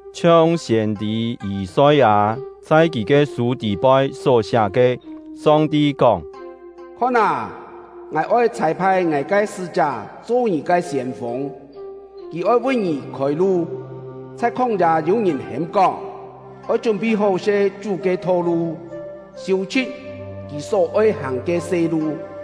Chhiong siên-tî Yî-soi-â chhai kì ke sû tî-poi só-siá ke: Song-ti kóng: “Khon â, Ngài oi chhâi-phai Ngài ke sṳ́-chá cho ngì ke siên-fûng; kì oi vi ngì khôi-lu.” Chhai khóng-yâ yû ngìn hêm-kóng: “Oi chún-phi hó-se Chú ke tho-lu, siû-chhṳ̍t Kì só-oi hàng ke se-lu!”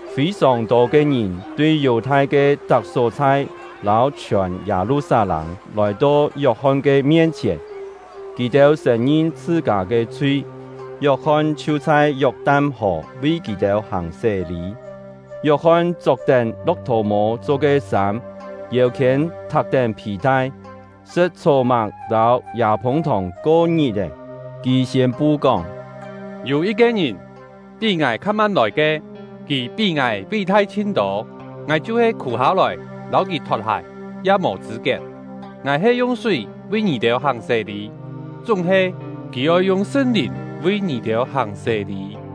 Fî-sòng tô ke ngìn tui Yù-thai ke tak só-chhai lâu chhiòn Yâ-lu-sat-lâng lòi-to Yok-hon ke mien-chhièn. Kì-têu sṳ̀n-ngin chhṳ-kâ ke chhui; Yok-hon chhiu chhai Yok-tan-hò vi kì-têu hàng sé-lî. Yok-hon chok-tén lo̍k-thò-mô cho ke sâm, yêu-khiên thak-tén phì-tai; sṳ̍t chhó-máng lâu yâ-phûng-thòng ko ngit-è. Kì siên-pu kóng: “Yû yit-ke ngìn, pí ngài kha-man lòi ke, kì pí ngài ví-thai chhin-tô. Ngài chhiu-he khù-hâ-lòi lâu kì thot-hài ya mò chṳ̂-kiet. Ngài he yung súi vi ngì-têu hàng sé-lî, chúng-he kì oi yung Sṳn-Lìn vi ngì-têu hàng sé-lî.”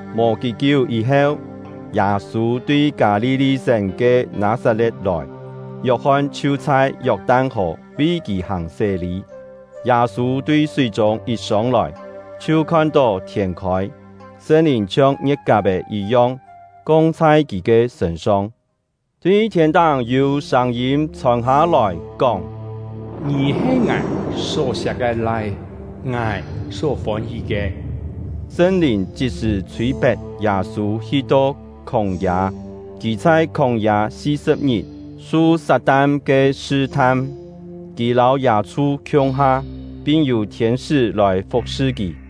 Mò kí-kiú yî-heu, Yâ-sû tui Kâ-li-li-sén ke Nâ-sat-le̍t lòi, Yok-hon chhiu chhai Yok-tan-hò vi kì hàng sé-lî. Yâ-sû tui súi-chûng yit sông-lòi, chhiu khon-tó thiên-khôi, Sṳn-Lìn chhiong ngie̍t-kap-è yit-yong, kong chhai kì ke sṳ̂n-song; tui thiên-táng yû sâng-yîm chhòn hâ-lòi, kóng: “Ngì he Ngài só-siak ke Lai-é, Ngài só fôn-hí ke.” Sṳn-Lìn chit-sṳ̀ chhûi-pet Yâ-sû hi-to khóng-yâ. Kì chhai khóng-yâ si-sṳ̍p ngit, su Sat-tan ke sṳ-tham; kì lâu yâ-chhu khiung-ha, pin yû thiên-sṳ́ lòi fu̍k-sṳ kì.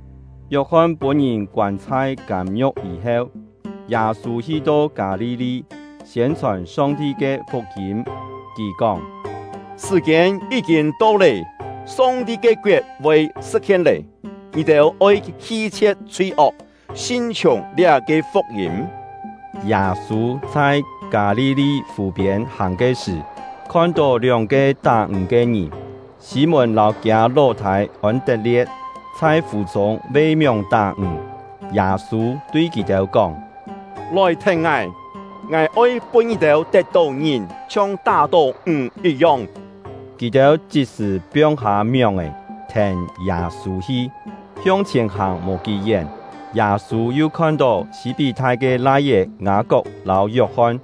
Yok-hon pûn-ngìn koân chhai kâm-ngiu̍k yî-heu, Yâ-sû hi-to Kâ-li-li, siên-chhòn Song-ti ke fuk-yîm. Kì kóng: “Sṳ̀-kiên yí-kîn to lé, Song-ti ke koet voi sṳ̍t-hien lé! Ngì-têu oi hi-chhie̍t chhui-ok, sin-chhiùng liá-ke fuk-yîm.” Yâ-sû chhai Kâ-li-li fù-piên hàng ke sṳ̀, khon-tó lióng-ke tá-ǹg ke ngìn — Sî-mùn lâu kiâ ló-thâi Ôn-tet-lie̍t — chhai fù-chûng ve-mióng tá-ǹg. Yâ-sû tui kì-têu kóng: “Lòi thèn ngài! Ngài oi pûn ngì-têu tet-tó ngìn chhiong tá-tó ǹg yit-yong.” Kì-têu chit-sṳ̀ piong-hâ mióng-è, thèn Yâ-sû hi. Hiong-chhièn hàng mò kí-yén, Yâ-sû yu khon-tó Sî-pí-thai ke lai-é Ngâ-kok lâu Yok-hon;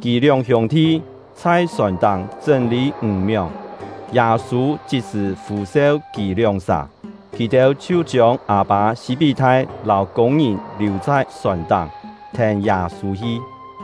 kì lióng hiûng-thi chhai sòn-táng chṳ́n-lî ǹg-mióng. Yâ-sû chit-sṳ̀ fû-seu kì lióng-sà, kì-têu chhiu chiông â-pâ Sî-pí-thai lâu kûng-ngìn liù chhai sòn-táng, thèn Yâ-sû hi.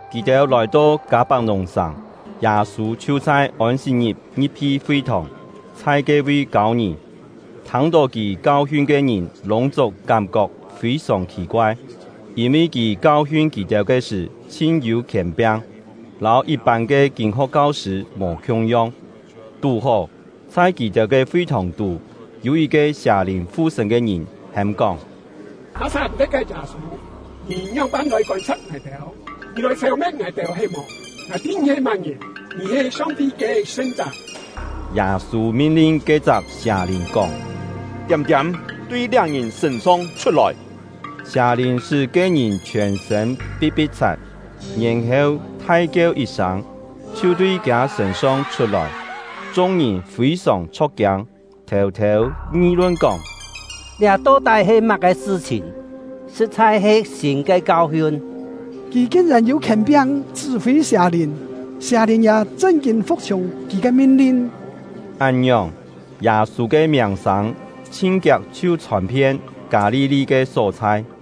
Kì-têu lòi-to Kâ-pak-nùng-sàng, Yâ-sû chhiu chhai Ôn-sit-ngit ngi̍p-hi fi-thòng, chhai ke-vi kâu ngìn. Thâng-tó kì kau-hiun ke ngìn lûng-chúng kám-kok fî-sòng khì-koai, yîn-vi kì kau-hiun kì-têu ke sṳ̀ chhin-yû khièn-piang, lâu yit-pân ke kîn-ho̍k kau-sṳ̂ mò khiung-yong. Tú-hó, chhai kì-têu ke fi-thòng-tú yû yit-ke sià-lìn fu-sṳ̂n ke ngìn hêm-kóng: “Nâ-sat-le̍t ke Yâ-sû, ngì ngióng-pân lòi kôn-sa̍p ngài-têu? Ngì lòi sêu-me̍t ngài-têu he-mò? Ngài tî ngì he má-ngìn; ngì he Song-ti ke Sṳn-chá!” Yâ-sû min-lin ke-chak sià-lìn kóng: “Tiâm-tiâm, tui liá ngìn sṳ̂n-song chhut-lòi!” Sià-lìn sṳ́ ke-ngìn chhiòn-sṳ̂n pi̍t-pi̍t-chhat, yèn-heu thai-kieu yit sâng, chhiu tui kiâ sṳ̂n-song chhut-lòi. Chung-ngìn fî-sòng chho̍k-kiâng, thêu-thêu ngi-lun kóng: “Liá to-tái he má-ke sṳ-chhìn! Sṳ̍t-chhai he sîn ke kau-hiun! Kì kin-yèn yû khièn-piang chṳ́-fî sià-lìn, sià-lìn ya chṳn-kîn fu̍k-chhiùng kì ke min-lin!” Án-ngiòng, Yâ-sû ke miàng-sâng chhin kiak chhiu chhòn-phien Kâ-li-li ke só-chhai.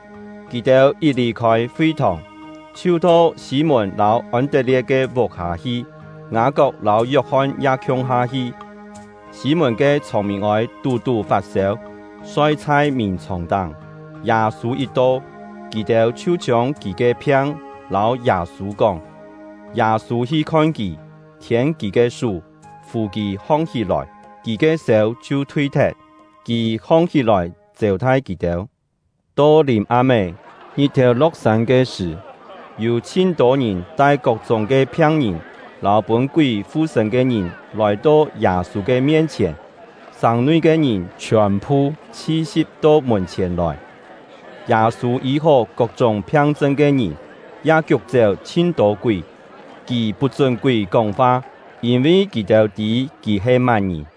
Kì-têu yit lì-khôi fi-thòng, chhiu to Sî-mùn lâu Ôn-tet-lie̍t ke vuk-hâ hi; Ngâ-kok lâu Yok-hon ya khiung-ha hi. Sî-mùn ke chhông-mîn-ôi tú-tú fat-sêu, soi chhai mìn-chhòng-táng; Yâ-sû yit to, kì-têu chhiu chiông kì ke phiang lâu Yâ-sû kóng. Yâ-sû hi khon kì, khiên kì ke sú, fù kì hong-hí-lòi. Kì ke sêu chhiu thui-thet; kì hong-hí-lòi chêu-thai kì-têu. To lìm-am-é, ngit-thèu lo̍k-sân ke sṳ̀, yû chhin-tô ngìn tai kok-chúng ke phiang-ngìn lâu pûn-kúi fu-sṳ̂n ke ngìn lòi-to Yâ-sû ke mien-chhièn; sàng-nui ke ngìn chhiòn-phu chhi-si̍p to mùn-chhièn lòi. Yâ-sû yî-hó kok-chúng phiang-chṳn ke ngìn, ya kiuk-chéu chhin-tô kúi. Kì put-chún kúi kóng-fa, yîn-vi kì-têu tî kì he má-ngìn.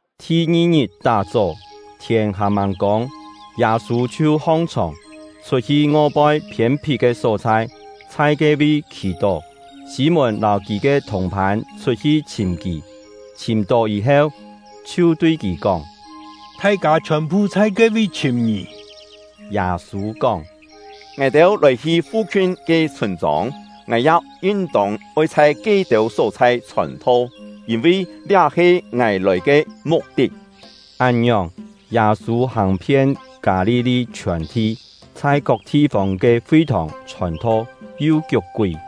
Thi-ngi-ngit tá-chó, thiên hàn-màng kông, Yâ-sû chhiu hong-chhòng, chhut-hi ngoi-poi phiên-phit ke só-chhai, chhai ke-vi khì-tó. Sî-mùn lâu kì ke thùng-phân chhut-hi chhìm kì; chhìm-tó yî-heu, chhiu tui kì kóng: “Thai-kâ chhiòn-phu chhai ke-vi chhìm ngì!” Yâ-sû kóng: “Ngài-têu lòi-hi fu-khiun ke chhûn-chông, ngài ya yin-tông oi chhai ke-têu só-chhai chhòn-tho, yîn-vi liá he ngài lòi ke muk-tit.” Án-ngiòng, Yâ-sû hàng-phien Kâ-li-li chhiòn-thi, chhai kok thi-fông ke fi-thòng chhòn-tho, yu kiuk-kúi.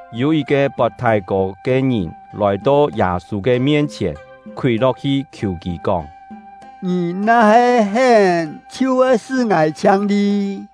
Yû yit-ke pot thái-kô ke ngìn lòi-to Yâ-sû ke mien-chhièn, khúi lo̍k-hi khiù kì kóng: “Ngì na-he hén, chhiu voi sṳ́ ngài chhiang-li.”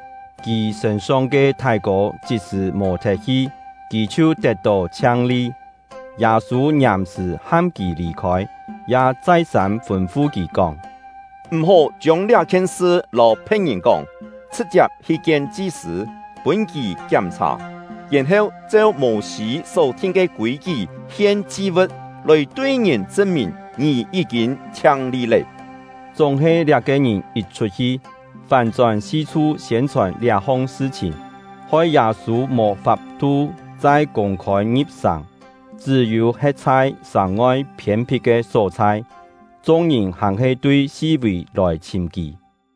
Kì sṳ̂n-song ke thái-kô chit-sṳ̀ mò-thet hi, kì chhiu tet-tó chhiang-li. Yâ-sû ngiàm-sṳ̀ ham kì lì-khôi, ya chai-sâm fûn-fu kì kóng: “M̀-hó chiông liá-khien sṳ lâu phe̍t-ngìn kóng; chhṳ̍t-chiap hi kien chi-sṳ̂, pûn kì kiám-chhà, yèn-heu cheu Mô-sî só-thin ke kûi-kí hien chi-vu̍t, lòi tui ngìn chṳn-mìn ngì yí-kîn chhiang-li lé.” Chúng-he liá-ke ngìn yit chhut-hi, fán-chón si-chhu siên-chhòn liá-hong sṳ-chhìn, hoi Yâ-sû mò fap-thu chai kûng-khôi ngi̍p-sàng, chṳ́-yû he̍t chhai sàng-ngoi phiên-phit ke só-chhai. Chung-ngìn hàn-he tui si-vì lòi chhìm kì.